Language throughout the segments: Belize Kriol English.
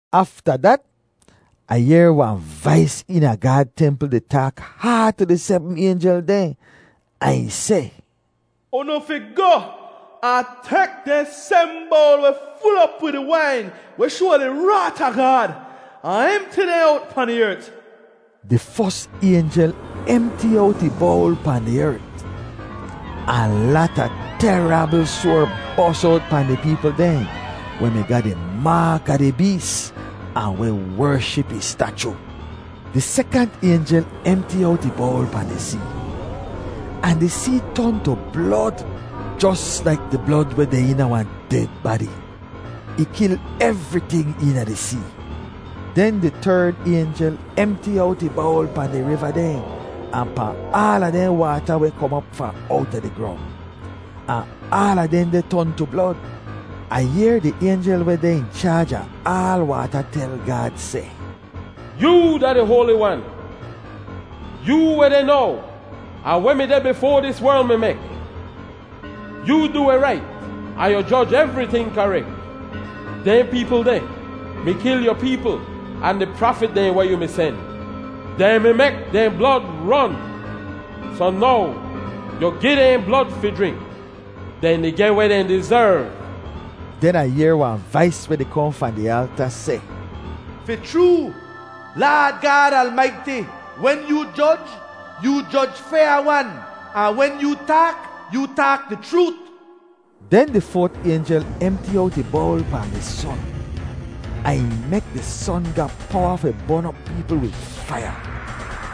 Afta dat, Ah yehr wahn vais eena Gaad templ di taak haad tu di sebm aynjel dehn ahn ih seh, “Unu fi goh ahn tek dehn sebm bowl weh ful op wid di wain weh shoa di raat a Gaad ahn emti dehn owt pahn di ert!” Di fos aynjel emti owt ih bowl pahn di ert. Ahn lata terabl soar bos owt pahn di peepl dehn weh mi ga di maak a di bees ahn weh wership ih stachu. Di sekant aynjel emti owt ih bowl pahn di see. Ahn di see ton tu blod, jos laik di blod weh deh eena wahn ded badi. Ih kil evriting eena di see. Den di terd aynjel emti owt ih bowl pahn di riva dehn ahn pahn aala dehn waata weh kom op fahn owta di grong, ahn aala dehndeh ton tu blod. Ah yehr di aynjel weh deh in chaaj a aal waata tel Gaad seh, “Yoo da di Hoali Wan, yoo weh deh now ahn weh mi deh bifoa dis werl mi mek. Yoo du weh rait ahn yu joj evriting karek! Dehn peepl deh mi kil yu peepl ahn di prafit dehn weh yu mi sen. Dehn mi mek dehn blod ron, soh now yu gi dehn blod fi jrink. Dehn di geh weh dehn dizerv!” Den Ah yehr wahn vais weh di kohn fahn di alta seh, “Fi chroo, Laad Gaad Almaiti, wen yoo joj, yoo joj fyaa-wan, ahn wen yoo taak, yoo taak di chroot!” Den di foat aynjel emti owt ih bowl pahn di son, ahn ih mek di son ga powa fi bon op peepl wid faiya.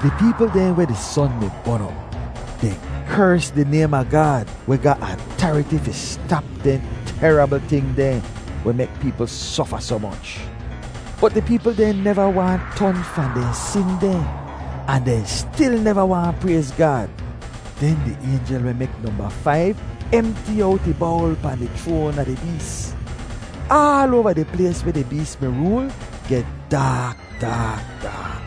Di peepl dehn weh di son mi bon op, dehn kers di naym a Gaad, weh ga atariti fi stap dehn terabl ting dehn weh mek peepl sofa soh moch. Bot di peepl dehn neva waahn ton fahn dehn sin dehn ahn dehn stil neva waahn prayz Gaad. Den di aynjel weh mek nomba faiv emti owt ih bowl pahn di chroan a di bees. Aal oava di plays weh di bees mi rool geh daak daak daak.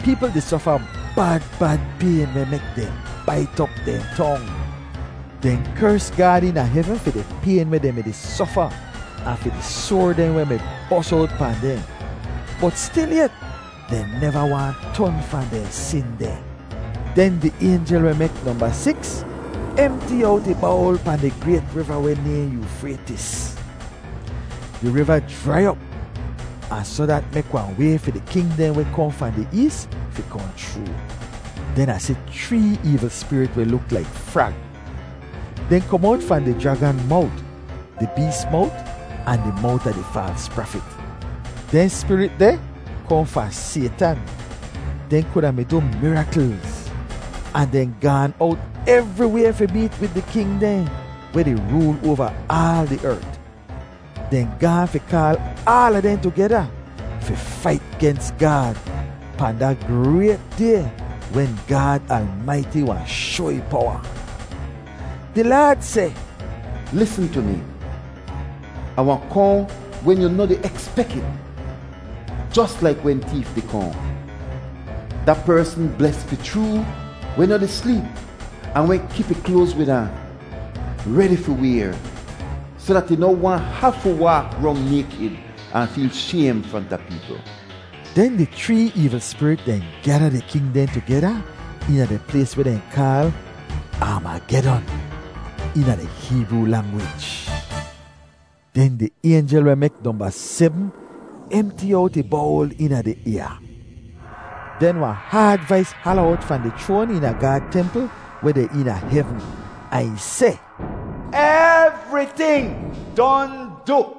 Peepl di sofa bad bad payn weh mek dehn bait op dehn tong. Dehn kers Gaad eena hevn fi di payn weh dehn mi-di sofa ahn fi di soar dehn weh mi bos owt pahn dehn. Bot stilyet, dehn neva waahn ton fahn dehn sin dehn. Den di aynjel weh mek nomba siks emti owt ih bowl pahn di grayt riva weh nayhn Yoofraytis. Di riva jrai op, ahn soh dat mek wahn way fi di king dehn weh kohn fahn di ees fi kohn chroo. Den Ah si chree eevl spirit weh luk laik frag. Dehn kom owt fahn di jragan mowt, di bees mowt ahn di mowt a di faals prafit. Dehn spirit deh kohn fahn Saytan. Dehn kuda mi du miraklz, ahn dehn gaan owt evriway fi meet wid di king dehn weh di rool oava aal di ert. Dehn gaahn fi kaal aala dehn tugeda fi fait gens Gaad pahn da grayt Day wen Gaad Almaiti wahn shoa ih powa. Di Laad seh, “Lisn tu mi! Ah wahn kohn wen yu noh di ekspek it, jos laik wen teef di kohn! Da persn bles fi chroo weh noh di sleep ahn weh kip ih kloaz wid ahn, redi fi wayr, soh dat ih noh wahn hafu waak rong naykid ahn feel shaym fronta peepl.” Den di chree eevl spirit dehn gyada di king dehn tugeda eena di plays weh dehn kaal “Armagedon” eena di Heebroo langwij. Den di aynjel weh mek nomba sebm emti owt ih bowl eena di ayaa. Den wahn haad vais hala owt fahn di chroan eena Gaad templ weh deh eena hevn ahn ih seh, “Evriting don du!”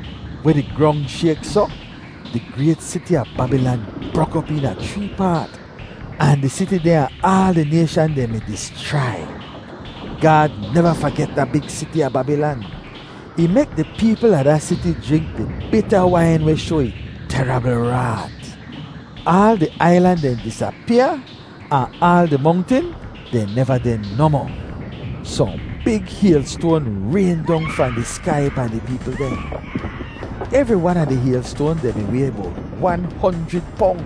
Weh di grong shayk soh, di grayt siti a Babilan brok op eena chree paat, ahn di siti dehn a aal di nayshan dehn mi dischrai. Gaad neva faget da big siti a Babilan. Ih mek di peepl a da siti jrink di bita wain weh shoa ih terabl raat. Aal di ailan dehn disapyaa ahn aal di mongtin dehn neva deh nohmoh. Sohn big haylstoan rayn dong fahn di skai pahn di peepl dehn. Evri wan a di haylstoan dehn mi way bowt wan honjrid pong.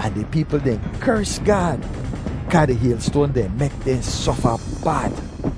Ahn di peepl dehn kers Gaad, kaa di haylstoan dehn mek dehn sofa bad.